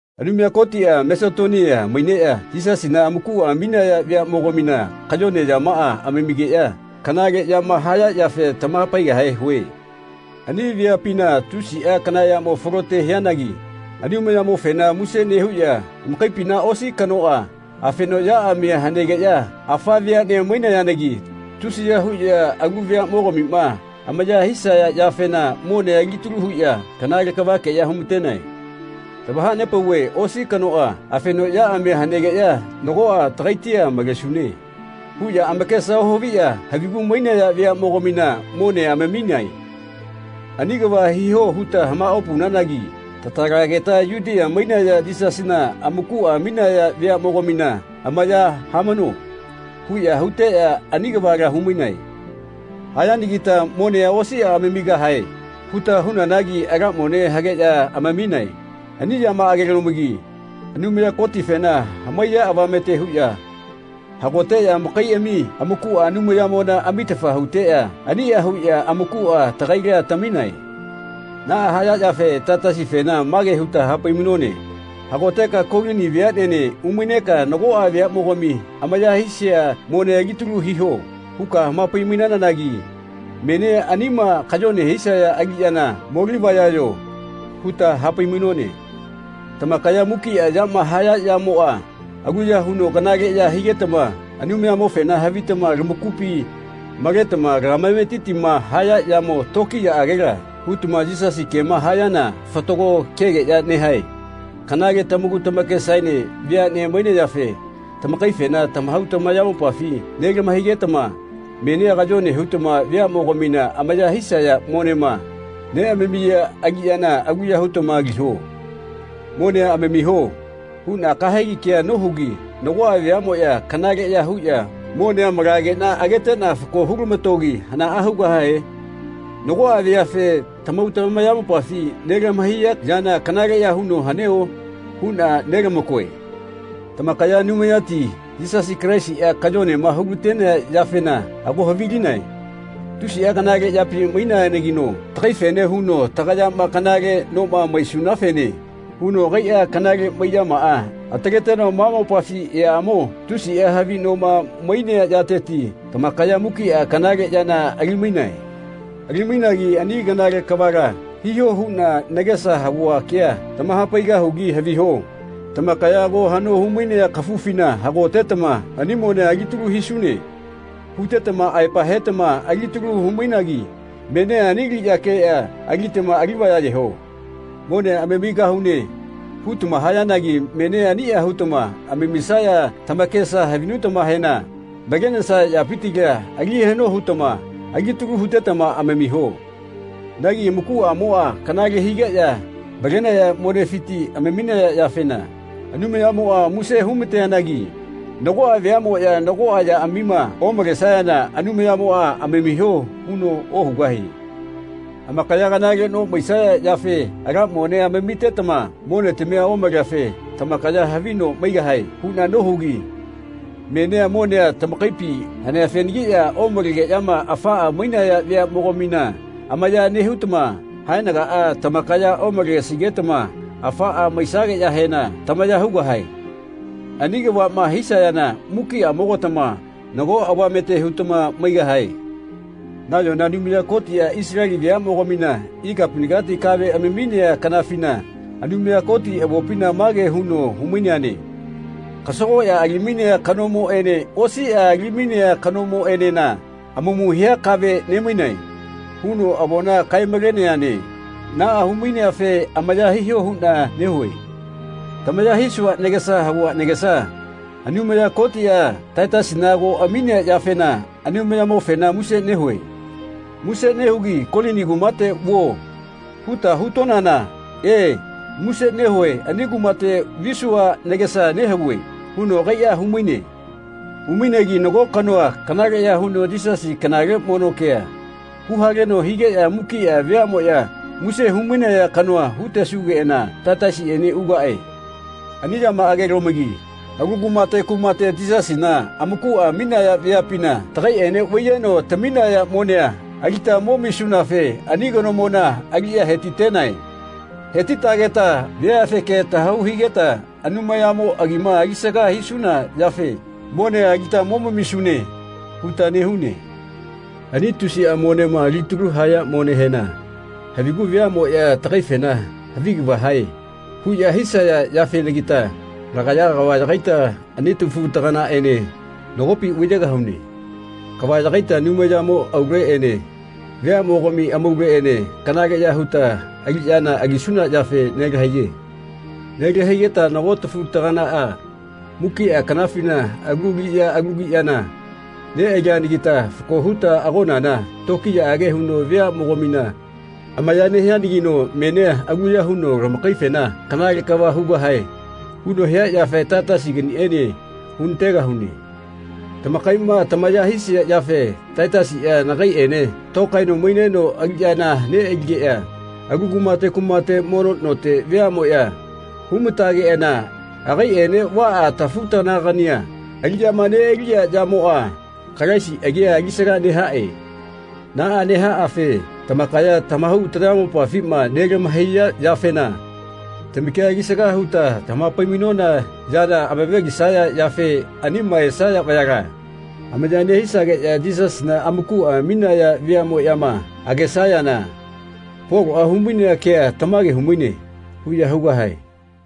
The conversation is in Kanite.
Anumaya Kotiꞌa Masetonia maineꞌya Yisasina amakuꞌa aminaya veaꞌmogamina kayone yamaꞌa amamigeꞌya kanale yama haya yafe tamahapaigahe hue. Ani veapina tusiꞌa kana yamo falote hianagi Anumayamofena muse nehuꞌya amakaipina osi kanoꞌa afeno yaꞌamia hanegeꞌya afa veaꞌne maiyanagi tusiya huꞌya alu veaꞌmogamima amaya hisaya yafena monea alitalu huꞌya kanale kavakeꞌya humatenae. Tamahanepauve osi kanoꞌa afeno yaꞌamia hanegeꞌya “Nagoꞌa tagaitia malesune.” huꞌya amakesa ohaviꞌya havigu mainaya veaꞌmogamina monea amaminae. “Ani kava hiho.” huta hamaꞌopaunanagi “Tatalageta Yutia maineꞌya Yisasina amakuꞌa aminaya veaꞌmogamina amaya hamano.” huꞌya huteꞌya ani kavala humainae. Hayanagita “Monea osiꞌa amamigahae.” huta hunanagi ala mone hageꞌya amaminae. Ani yamaꞌagelomagi Anumaya Kotifena hamaiya avamete huꞌya hagoteꞌya amakaiꞌami amakuꞌa Anumayamona amitafa huteꞌya aniꞌa huꞌya amakuꞌa tagaila taminae. Naꞌa hayafe Taitasifena mage huta hapai-mainone “Hagoteka Kolini veaꞌnene umaineka ‘Nagoꞌa veaꞌmogami amaya hisia monea alitalu hiho.’ huka hamapai-mainanagi menia anima kayone hisaya aliꞌyana molivayayo.” huta hapai-mainone. Tamakaya mukiꞌa yama haya yamoꞌa aluya huno kanale ya higetama Anumayamofena havitama lamakupi maletama lamametitima haya yamo tokiyaꞌagela hutama Yisasi kema hayana fatago kegeꞌya nehae. Kanale tamaku tamakesaene veaꞌne mainayafe tagaifena tamahau tamayamopafi nelama-hainagetama menia kayone hutama veaꞌmogamina amaya hisaya monema neꞌamamiya aliꞌyana aluya hutama aliho. “Monea amamiho.” huꞌna kahegi kea nohugi nagoꞌa veaꞌmoꞌya kanaleꞌya huꞌya monea malageꞌna ageteꞌna fako hulamatogi hanaꞌa hugahae? Nagoꞌa veafe tamahau tamayamopafi nelahamaiya yana kanaleꞌya huno haneo? huꞌna nelamakoe. Tamakaya Anumayati Yisasi Kalaisiꞌa kayonema hulatenea yafena ago havilinae. Tusiꞌa kanale yapi maineanagino tagaifene huno tagayama kanale noma maisunafene huno agaiꞌa kanale maiꞌyamaꞌa ataleteno ma mopafi eaꞌamo tusiꞌa havi noma mainea yateti tamakaya mukiꞌa kanale yana ali-mainae. Ali-mainagi ani kanale kavala hiho huꞌna nagesa havua kea tamahapaigahugi haviho. Tamakaya ago haꞌno humainea kafufina hagotetama “Ani monea alitalu hisune.” hutetama aepa hetama alitalu hu-mainagi menia ani aliꞌyakeꞌya alitama alivayayeho. “Monea amamigahune.” hutama hayanagi menia aniꞌa hutama amamisaya tamakesama havinutamahena malenesaya yapitila ali haꞌno hutama alitalu hutetama amamiho. Nagi amakuꞌamoꞌa kanale higeꞌya malenaya monefiti amaminaya yafena Anumayamoꞌa muse humateanagi nagoꞌa veaꞌmoya nago yaꞌamima omalesayana Anumayamoꞌa “Amamiho” huno ohugahie. “Amakaya kanale no maisaya yafe ala monea amamitetama monetamia omaleafe tamakaya havi no maigahae.” huꞌna nohugi menia monea tamakaipi haneafenagiꞌya omalegeꞌyama afaꞌa mainaya veaꞌmogamina amaya nehutama haenagaꞌa tamakaya omalesigetama afaꞌa maisageꞌyahena tamaya hugahae. Ani kavaꞌma hisayana mukiꞌamogatama nago avamete hutama maigahae. Nayona Anumaya Kotiꞌa Isaleli veaꞌmogamina ikapinagati kave amaminea kanafina Anumaya Koti avopina mage huno hu-maineane “Kasagoꞌya ali-mainea kanomoꞌene osiꞌa ali-mainea kanomoꞌenena amamu hia kave nemainae.” huno avona kae-maleneane. Naꞌa humaineafe amaya hiho huꞌna nehue. Tamaya hisua nagesa havua nagesa Anumaya Kotiꞌa Taitasina ago aminea yafena Anumayamofena muse nehue. Muse nehugi “Kolini kumate vuo.” huta hutonana “E, muse nehue ani kumate visua nagesa nehavue.” huno agaiꞌa humaine. Humainegi nago kanoa kanaleꞌya huno Yisasi kanale mono kea huhaleno higeꞌya mukiꞌa veaꞌmoꞌya muse humainaya kanoa hutesugeꞌana Taitasiꞌene ugaꞌe. Ani yamaꞌagelomagi alu kumate kumate Yisasina amakuꞌa aminaya veapina tagaiꞌene vaiyeno taminaya monea alita momisunafe ani kanomona aliꞌya hetitenae. Hetitageta veafeke tahau higeta Anumayamo agima alisaga hisuna yafe “Monea alita momamisune.” huta nehune. Ani tusiꞌa monema alitalu haya monehena havigu veaꞌmoꞌya tagaifena “Havi kava hae.” huꞌya hisaya yafenagita lagaya kava yagaita ani tafutaganaꞌene nagopi vaiyegahune. Kava yagaita Anumayamo auleꞌene veaꞌmogami amauleꞌene kanaleꞌya huta aliꞌyana alisuna yafe nelahaiye. Nelahaigeta nago tafu-taganaꞌa mukiꞌa kanafina alu aliꞌya alu aliꞌyana neꞌalianagita fako huta agonana tokiyaꞌage huno veaꞌmogamina amaya nehianagino menia aluya huno lamakaifena “Kanale kava hugahae.” huno hia yafe Taitasiganiene hunategahune. Tamakaiꞌma tamaya hisia yafe Taitasiꞌa nagaiꞌene tokaeno maineno aliꞌyana neꞌaligeꞌya alu kumate kumate mono note veaꞌmoꞌya humatageꞌana agaiꞌene vaꞌa tafu-taganagania aliꞌyama neꞌaliꞌa yamoꞌa Kalaisi agia alisaga nehaꞌe. Naꞌa nehaꞌafe tamakaya tamahau tamayamopafima nelahamaiya yafena tamakia alisaga huta hamapai-mainona yana amave-lisaya yafe anima esaya vayala amaya nehisageꞌya Yisasina amakuꞌa aminaya veaꞌmoꞌyama agesayana “Poloꞌa humainea kea tamage humaine.” huꞌya hugahae.